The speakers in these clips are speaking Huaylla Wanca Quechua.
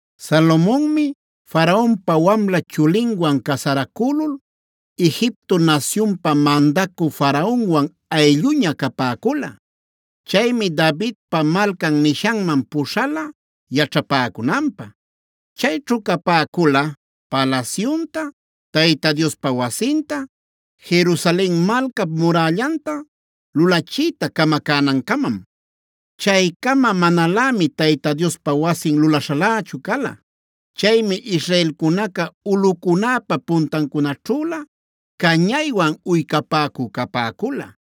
Salomonmi Faraonpa wamla chulinwan casaracülul Egipto nasyunpa mandacü Faraonwan aylluña capäcula. Chaymi Davidpa Malcan nishanman puśhala yaćhapäcunanpä. Chayćhu capäcula palasyunta, Tayta Diospa wasinta, Jerusalen malcap murällanta lulachiyta camacänancamam. Chaycama manalämi Tayta Diospa wasin lulaśhalächu cala. Chaymi israelcunaca ulꞌucunäpa puntancunaćhüla cañaywan uycapäcü capäcula.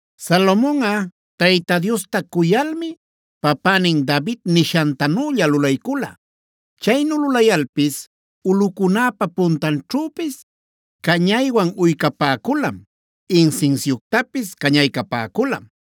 Salomonꞌa Tayta Diosta cuyalmi papänin David nishantanülla lulaycula. Chaynu lulayalpis ulꞌucunäpa puntanćhüpis cañaywan uycapäculam, insinsiuctapis cañaycapäculam.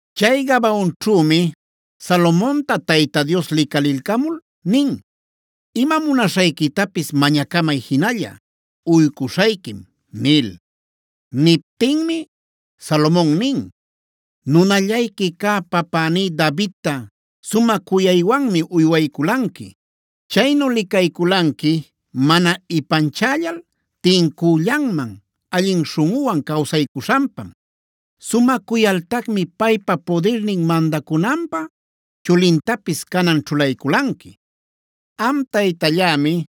Chay Gabaonćhümi Salomonta Tayta Dios licalilcamul nin: “Ima munaśhayquitapis mañacamay jinalla; uycuśhayquim” nil. Niptinmi Salomon nin: “Nunallayqui cä papäní Davidta sumä cuyaywanmi uywayculanqui. Chaynu licayculanqui mana ipanchällal, tincüllanman, allin śhunꞌuwan cawsaycuśhanpam. Sumä cuyaltacmi paypa pudirnin mandacunanpä chulintapis canan ćhulaycunqui. Am Taytallämi,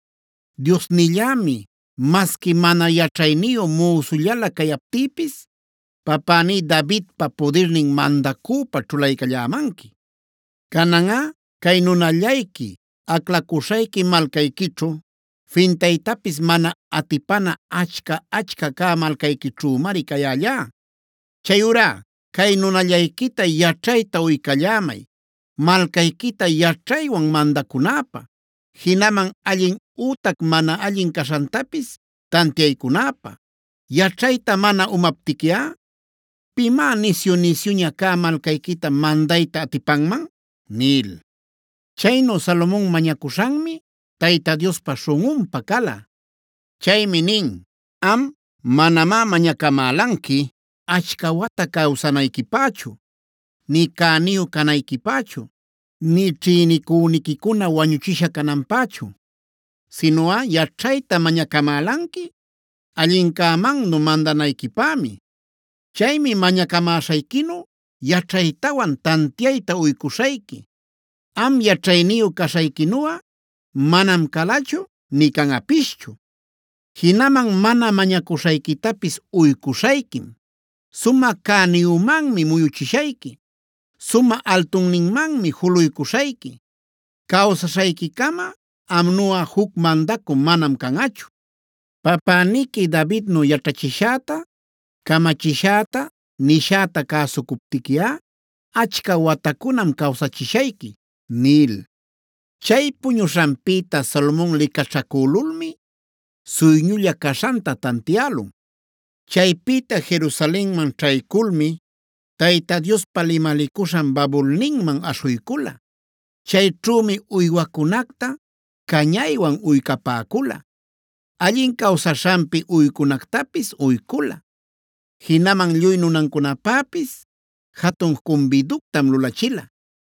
Diosnillämi, masqui mana yaćhayniyu müsullala cayaptïpis papäní Davidpa pudirnin mandacüpä ćhulaycallämanqui. Cananꞌa cay nunallayqui, aclacuśhayqui malcayquićhu, fintaytapis mana atipana achca-achca cä malcayquićhümari cayällá. Chayurá cay nunallayquita yaćhayta uycallämay malcayquita yaćhaywan mandaycunäpä, jinaman allin ütac mana allin caśhantapis tantiaycunäpä. Yaćhayta mana umaptiquiꞌa ¿pimá nisyu-nisyuña cä malcayquita mandayta atipanman?” nil. Chaynu Salomon mañacuśhanmi Tayta Diospa śhunꞌunpä cala. Chaymi nin: “Am manamá mañacamälanqui achca wata cawsanayquipächu, nï cäniyu canayquipächu, nï ćhïnicüniquicuna wañuchisha cananpächu. Sinuꞌa yaćhayta mañacamälanqui allincämannu mandanayquipämi. Chaymi mañacamäśhayquinu yaćhaytawan tantiayta uycuśhayqui. Am yaćhayniyu caśhayquinuꞌa manam calachu nï canꞌapischu. Jinaman mana mañacuśhayquitapis uycuśhayquim: sumä cäniyümanmi muyuchishayqui, sumä altunninmanmi juluycuśhayqui. Cawsaśhayquicama amnuꞌa juc mandacü manam canꞌachu. Papäniqui Davidnu yaćhachishäta, camachishäta, nishäta cäsucuptiquiꞌa, achca watacunam cawsachishayqui” nil. Chay puñuśhanpïta Salomon licaćhacülulmi suyñulla caśhanta tantiälun. Chaypïta Jerusalenman ćhayculmi Tayta Diospa limalicuśhan babulninman aśhuycula. Chayćhümi uywacunacta cañaywan uycapäcula, allin cawsaśhanpi uycunactapis uycula. Jinaman lluy nunancunapäpis jatun cumbiductam lulachila.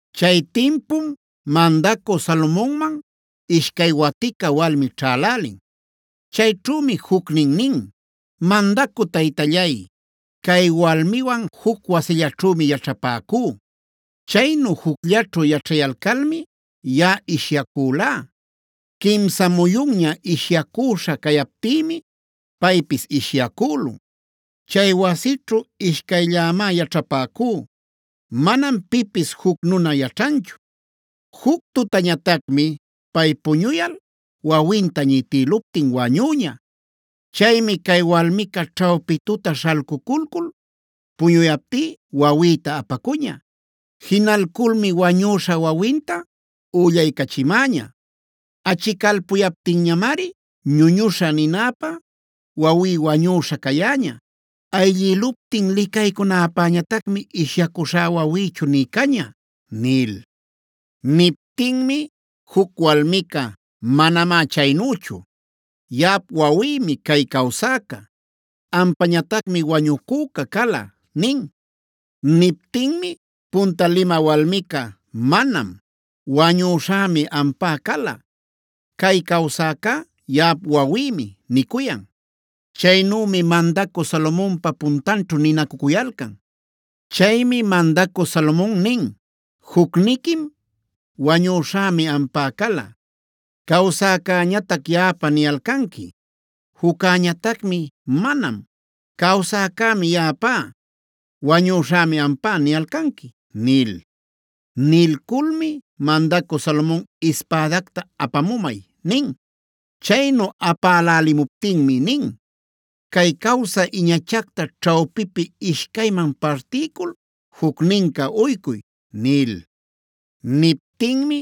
Chay timpum mandacü Salomonman ishcay watica walmi ćhälälin. Chayćhümi jucnin nin: “Mandacü taytallay, cay walmiwan juc wasillaćhümi yaćhapäcú. Chaynu jucllaćhu yaćhayalcalmi yaꞌa ishyacülá. Quimsa muyunña ishyacüśha cayaptïmi paypis ishyacülun. Chay wasićhu ishcayllämá yaćhapäcú. Manam pipis juc nuna yaćhanchu. Juc tutañatacmi pay puñuyal wawinta ñitïluptin wañüña. Chaymi cay walmica ćhawpi tuta śhalcuculcul puñuyaptí wawïta apacuña. Jinalculmi wañüśha wawinta üllaycächimäña. Achicalpuyaptinñamari ‘ñuñuśhä’ ninäpä wawí wañüśha cayäña. Ayllïluptin licaycunäpäñatacmi ishyacuśhá wawïchu nï caña” nil. Niptinmi juc walmica: “Manamá chaynüchu. Yaꞌap wawïmi cay cawsäca. Ampañatacmi wañucüca cala” nin. Niptinmi punta limä walmica: “Manam. Wañüśhämi ampa cala. Cay cawsäcá yaꞌap wawïmi” nicuyan. Chaynümi mandacü Salomonpa puntanćhu ninacücuyalcan. Chaymi mandacü Salomon nin: “Jucniquim: ‘Wañüśhämi ampa cala; cawsäcäñatac yaꞌapa’ niyalcanqui. Juccäñatacmi: ‘Manam. Cawsäcämi yaꞌapa; wañuśhämi ampa’ niyalcanqui” nil. Nilculmi mandacü Salomon: “Ispädacta apamumay” nin. Chaynu apalälimuptinmi nin: “Cay cawsä iñachacta ćhawpipi ishcayman partiycul jucnincä uycuy” nil. Niptinmi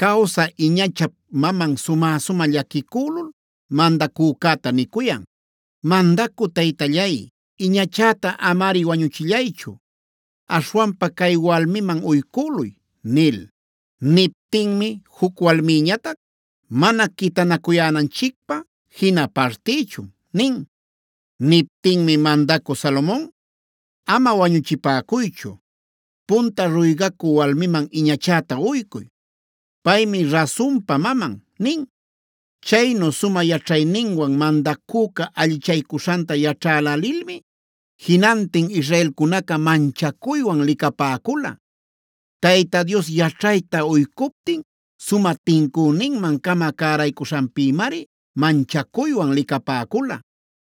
cawsä iñachap maman sumä-sumä llaquicülul mandacücäta nicuyan: “Mandacü taytallay, iñachäta amari wañuchillaychu. Aśhwanpa cay walmiman uycüluy” nil. Niptinmi juc walmïñatac: “Mana quitanacuyänanchicpä jina partïchun” nin. Niptinmi mandacü Salomon: “Ama wañuchipäcuychu. Punta ruygacü walmiman iñachäta uycuy. Paymi rasunpa maman” nin. Chaynu sumä yaćhayninwan mandacüca allichaycuśhanta yaćhalälilmi jinantin israelcunaca manchacuywan licapäcula. Tayta Dios yaćhayta uycuptin sumä tincüninman-cama cäraycuśhanpïmari manchacuywan licapäcula.